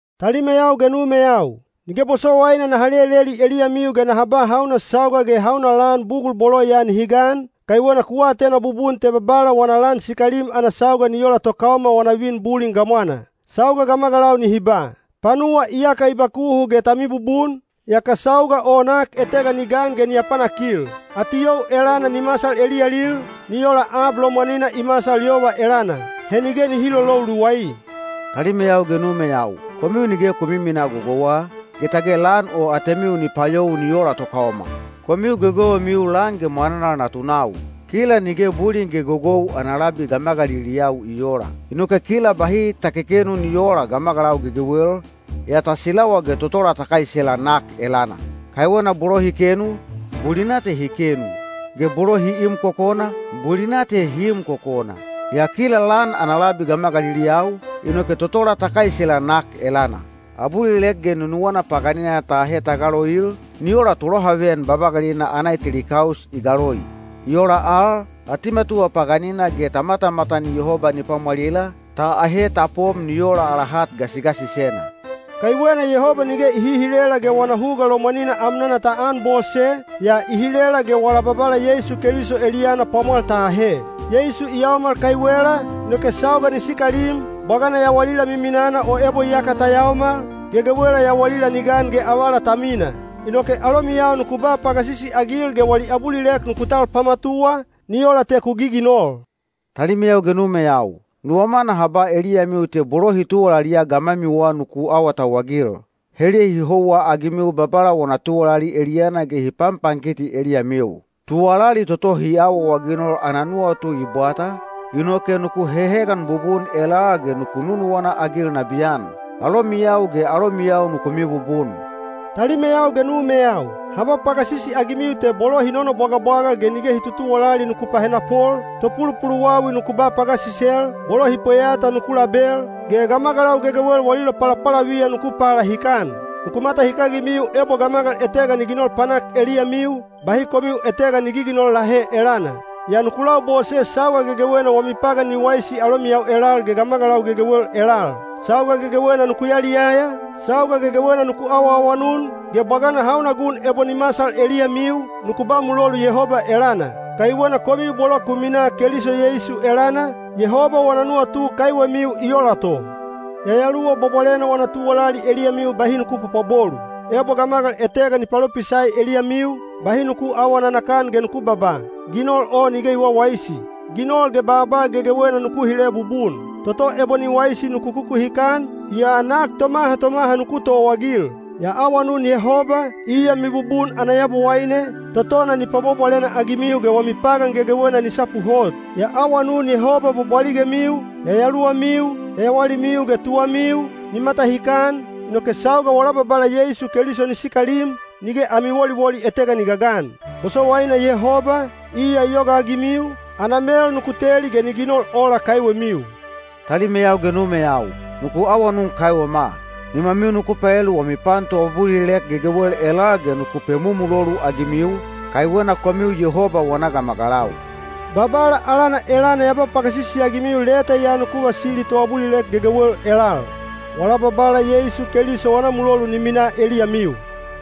Talimeyau ge numeyau, nige bosowaina naha leleli eliyamiu ge naha ba hauna sauga ge hauna lan bugul bolo ya nihi gan, kaiwena ku atena bubun te Babala wana lan sikalim ana sauga ni ola tokaoma wana vin bulin gamwana. Sauga gamagalau nihi ba, “Panuwa iyaka i bakuhu ge ta mibubun,” yaka sauga o nak etega ni gan ge ni apanakil. Atiyou elana ni masal eliyalil, ni ola ab lomwanina i masal yova elana. He nige nihi lolou luwai. Talimeyau ge numeyau, komiu nige ku miminaa gogouwa, ge tage lan o atemiu ni payou ni ola tokaoma. Komiu gegewemiu lan ge mwananal natunau. Kila nige bulin ge gogou ana labi gamagaliliyau i oola. Inoke kila bahi ta kekenu ni oola gamagalau gegewel, yaa ta silawa ge totola ta kaisela nak elana. Kaiwena bolo hi kenu, bulina te hi kenu, ge bolo hi im kokona, bulina te hi im kokona. Yaa kila lan ana labi gamagaliliyau, inoke totola ta kaisela nak elana. Abulilek ge nunuwana paganina ta ahe ta galoil, ni ola tolohaveyan babagalina ana eteli kaus i galoi. I ola al, atimatuwa paganina ge ta matamatan Yehoba ni pwamwalila, ta ahe ta pom ni ola ala hat gasigasisena. Kaiwena Yehoba nige i hihilela ge wana huga lomwanina amnana ta anbose, yaa i hilela ge wala Babala Yeisu Keliso eliyana pwamwal ta ahe. Yeisu i yaomal kaiwela, inoke sauga ni sikalim, bwagana yawalila miminana o ebo iyaka ta yaomal, gegewela yawalila ni gan ge avala ta mina. Inoke alomiyau nuku ba pagasisi-agil ge wali abulilek nuku tal pamatuwa, ni ola te ku giginol. Talimeyau ge numeyau, nuwama naha ba eliyamiu te bolo hi tuwalaliya gamwamiwa nuku awatauwagil. Heliya hi houwa-agimiu Babala wana tuwalali eliyana ge hi panpankiti eliyamiu. Tuwalali toto hi awaawaginol ana nuwatu i bwata, inoke nuku hehegan bubun elal ge nuku nunuwana-agil nabiyan. Alomiyau ge alomiyau nuku mibubun. Talimeyau ge numeyau, ha ba pagasisi-agimiu te bolo hi nonobwagabwaga ge nige hi tutuwalali nuku pahenapol, topulupuluwawi nuku ba pagasisel, bolo hi pweyata nuku label, ge gamagalau gegewel wali lopalapalaviyan nuku palahikan. Nuku matahikagimiu ebo gamagal etega ni ginol panak eliyamiu, bahi komiu etega ni giginol lahe elana. Yaa nuku labose sauga gegewena wami pagan ni waisi alomiyau elal ge gamagalau gegewel elal. Sauga gegewena nuku yaliyaya, sauga gegewena nuku awaawanun, ge bwagana hauna gun ebo ni masal eliyamiu, nuku ba mulolu Yehoba elana. Kaiwena komiu bolo ku minaa Keliso Yeisu elana, Yehoba wana nuwatu kaiwemiu i ola to. Yayaluwa Bwabwalena wana tuwalali eliyamiu bahi nuku pwapwabolu. Ebo gamagal etega ni palopisai eliyamiu, bahi nuku aawa nanakan ge nuku babaa, “Ginol o nige i wawaisi.” Ginol ge baaba gegewena nuku hile bubun. Toto ebo ni waisi nuku kukuhikan, yaa nak tomaha tomaha nuku towaagil. Ya awanun Yehoba, iya mibubun ana Yabowaine, totona ni pwabwabwalena-agimiu ge wami pagan gegewena ni sapu hot. Ya awanun Yehoba bwabwaligemiu, yayaluwamiu, yawalimiu ge tuwamiu, ni matahikan, inoke sauga wala Babala Yeisu Keliso ni sikalim, nige ami woliwoli etega ni gagan. Bosowaina Yehoba, iya i yogaagimiu, ana mel nuku teli ge ni ginol ola kaiwemiu. Talimeyau ge numeyau, nuku awanun kaiwema. Nimamiu nuku paelu wami pan toabulilek gegewel elal ge nuku pemumulolu-agimiu, kaiwena komiu Yehoba wana gamagalau. Babala alana elana ya ba pagasisi-agimiu leta ya nuku vasili toabulilek gegewel elal. Wala Babala Yeisu Keliso wana mulolu ni minaa eliyamiu.